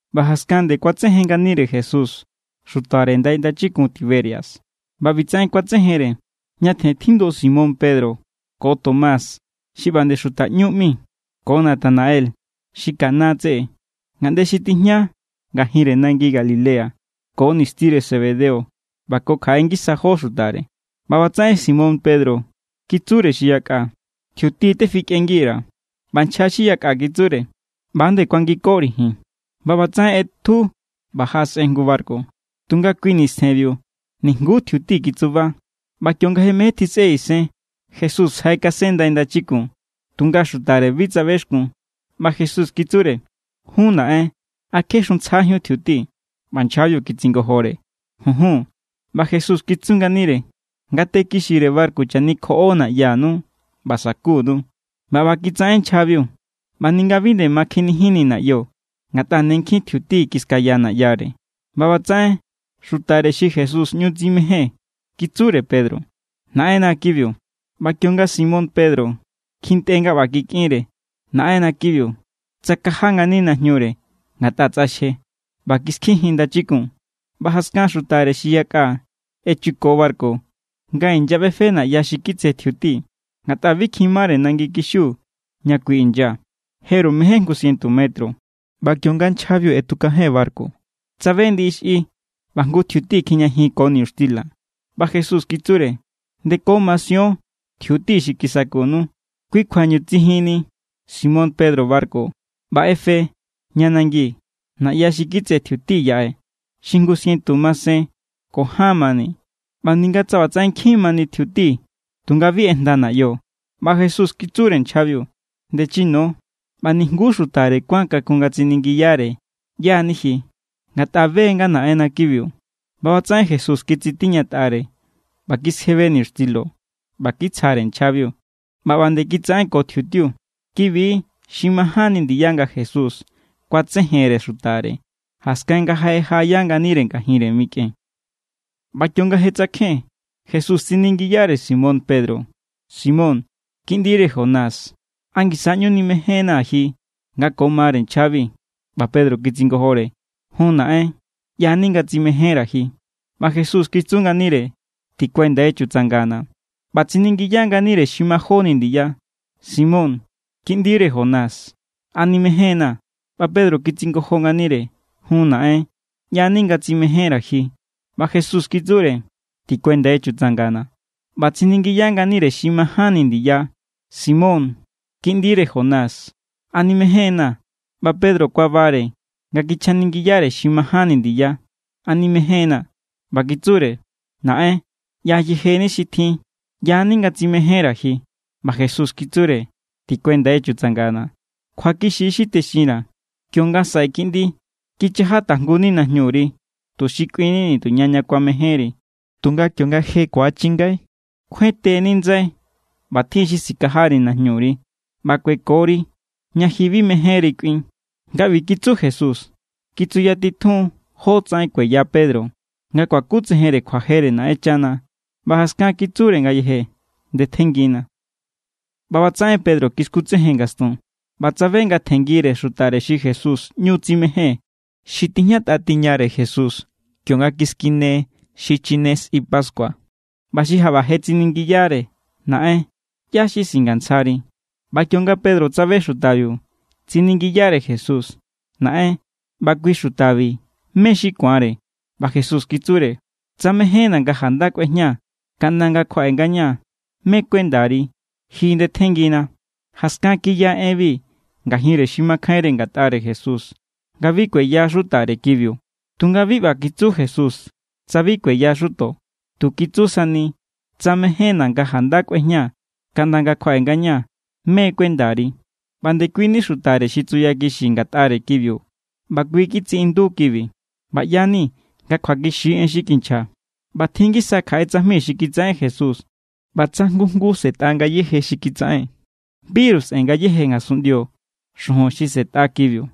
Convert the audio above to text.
ꞌBa jaskan nde kuatsejen nganire Jesús xutare ndai ndachikun Tiberias. ꞌBa ꞌbitsaꞌen kuatsejenre: Ñatjen tjindu Simón Pedro, ko Tomás xi ꞌba nde xuta ꞌñú ꞌmi, ko Natanael xi Caná tseꞌe, ngaꞌnde xi tijña ngajinre nangi Galilea, ko nistire Zebedeo, ꞌba ko kjaꞌe ngisa jó xutare. ꞌBa ꞌbatsaꞌen Simón Pedro kitsure xi yaka: —Tjiuti tefikꞌengi_ra̱. ꞌBa nchja xi yakꞌa kitsure: —ꞌBa=nde kuangikori̱ ji̱n. ꞌBa ꞌbatsaꞌen ꞌetju ꞌba jaꞌasꞌen jngu barku, tunga kui nistjenbiu nijnguú tjiuti kitsuba. ꞌBa kionga je mején tjisꞌe isen, Jesús jaꞌekasen ndai ndachikun, tunga xutare bi tsabexkun. ꞌBa Jesús kitsure: —Jun naꞌen, ¿a kje xuntsjajíun tjiuti? ꞌBa nchjabiu kitsingojore: —Junjun. ꞌBa Jesús kitsu nganire: —Ngate kixire barku chanikjoꞌo naꞌyanu ꞌba sa̱kunu. ꞌBa ꞌba kitsaꞌen nchjabiu, ꞌba ninga bi nde ma kjenijinni naꞌyo, ngatꞌa ne nkjin tjiuti kiskaya naꞌyare. ꞌBa ꞌbatsaꞌen xutare xi Jesús ꞌñu tsimején kitsure Pedro: —¡Naꞌenna kibiu! ꞌBa kionga Simón Pedro kjintꞌe nga ꞌba kikꞌinre: “Naꞌenna kibiu”, tsakaja ngani najñure (ngatꞌa tsꞌaxje) ꞌba kiskijin ndachikun. ꞌBa jaskan xutare xi yakꞌa echuko barku nga inyaꞌbefe naꞌya xi kitse tjiuti, ngatꞌa bi kjin mare nangi kixiu ña kui inya, jeru mején jngu sientu metro. ꞌBa kionga nchjabiu ꞌetukajen barku, tsabe ndiꞌi xꞌi, ꞌba jngu tjiuti kjijñajin ko niñuxtila. ꞌBa Jesús kitsure: —Ndeko masion tjiuti xi kisakunu. Kui kjuañu tsijunni Simón Pedro barku ꞌba ꞌefe ña nangi naꞌya xi kitse tjiuti yaꞌe, xi jngu sientu masen ko ján mani. ꞌBa ninga tsa ꞌbatsaꞌen nkjin mani tjiutiu, tunga bi ꞌejnda naꞌyo. ꞌBa Jesús kitsure nchjabiu: —Ndechino. ꞌBa nijnguú xutare kuán kakun nga tsiningiyare: “¿ꞌYá= ni ji?”, ngatꞌa be= nga Naꞌenna kibiu. ꞌBa ꞌbatsaꞌen Jesús kitsitiñatꞌare ꞌba kiskjebe niñuxtilo ꞌba kitsjare nchjabiu, ꞌba ꞌba nde kitsaꞌen ko tjiutiu. Kibi= xi majánni ndiya nga Jesús kuatsejenre xutare, jaskan nga je jaꞌaya nganire ngajinre mikꞌen. ꞌBa kionga je tsakjen, Jesús tsiningiyare Simón Pedro: —Simón, kiꞌndire Jonás, ¿a ngisa= ꞌñu nimejénnaa̱ ji nga ko mare nchjabi? ꞌBa Pedro kitsingojore: —Jun naꞌen, ꞌyani nga tsimejénra̱ ji. ꞌBa Jesús kitsu nganire: —Tikuendai chutsangana̱. ꞌBa tsiningiya nganire xi majóni ndiya: —Simón kiꞌndire Jonás, ¿a nimején=naa̱? ꞌBa Pedro kitsingojo nganire: —Jun naꞌen, ꞌyani nga tsimejénra̱ ji. ꞌBa Jesús kitsure: —Tikuendai chutsangana̱. ꞌBa tsiningiya nganire xi majánni ndiya: —Simón kiꞌndire Jonás, ¿a nimején=naa̱? ꞌBa Pedro kuabare nga kichjaningiyare xi majánni ndiya: “¿A nimején=naa̱?”, ꞌba kitsure: —Naꞌen, ꞌya yejeni xi tjin. ꞌYa=ni nga tsimejénra̱ ji. ꞌBa Jesús kitsure: —Tikuendai chutsangana̱. Kjuakixi= xi texinra̱. Kionga saꞌe kiꞌndi, kichaja tajngu=ni najñuri tuxi kꞌuinni nituña ña kuamejénri. Tunga kionga je ku̱achingai, kjuente=ni ndsai ꞌba tjin= xi sikajari najñuri ꞌba kuekori ña ji bi mejénri kꞌuin. Nga ꞌbi kitsu Jesús, kitsuyatitjuun jótsaꞌen kueya Pedro nga kuakutsejen kjuajere Naꞌenchana. ꞌBa jaskan kitsure ngayeje: —Ndetjenngina. ꞌBa ꞌbatsaꞌen Pedro kiskutsejen ngastun ꞌba tsabe nga tjenngire xutare xi Jesús ꞌñu tsimején, xi tijñatꞌa tiñare Jesús kionga kiskine xichine sꞌi pascua ꞌba xi jaꞌba je tsiningiyare: “Naꞌen, ¿ꞌyá xi singantsjari?” ꞌBa kionga Pedro tsabe xutabiu, tsiningiyare Jesús: —Naꞌen, ꞌba kui xutabi, ¿mé= xi ku̱anre? ꞌBa Jesús kitsure: —Tsa mejénna̱ nga janda kꞌuejña kaꞌnda nga kjuaꞌe ngañaa̱, ¿mé= kuendari? Ji ndetjenngina. Jaskan kiya enbi ngajinre xi makjainre ngatꞌare Jesús, nga bi kueya xutare kibiu. Tunga bi ꞌba kitsu Jesús, tsa bi kueya xuto. Tu kitsu sani: “Tsa mejénna̱ nga janda kꞌuejña kaꞌnda nga kjuaꞌe ngañaa̱, ¿mé= kuendari?” ꞌBa ndekuini xutare xi tsuyakixi ngatꞌare kibiu ꞌba kui kitsiꞌindu kibi. ꞌBa ꞌya=ni̱ nga kjuakixi= en xi kinchja. ꞌBa tjin= ngisa kjaꞌe tsajmi xi kitsaꞌen Jesús. ꞌBa tsa jngu jngu sꞌe̱tꞌa ngayéje xi kitsaꞌen, biru sꞌe̱n ngayéje ngasunꞌndio xujun xi sꞌe̱tꞌa kibiu.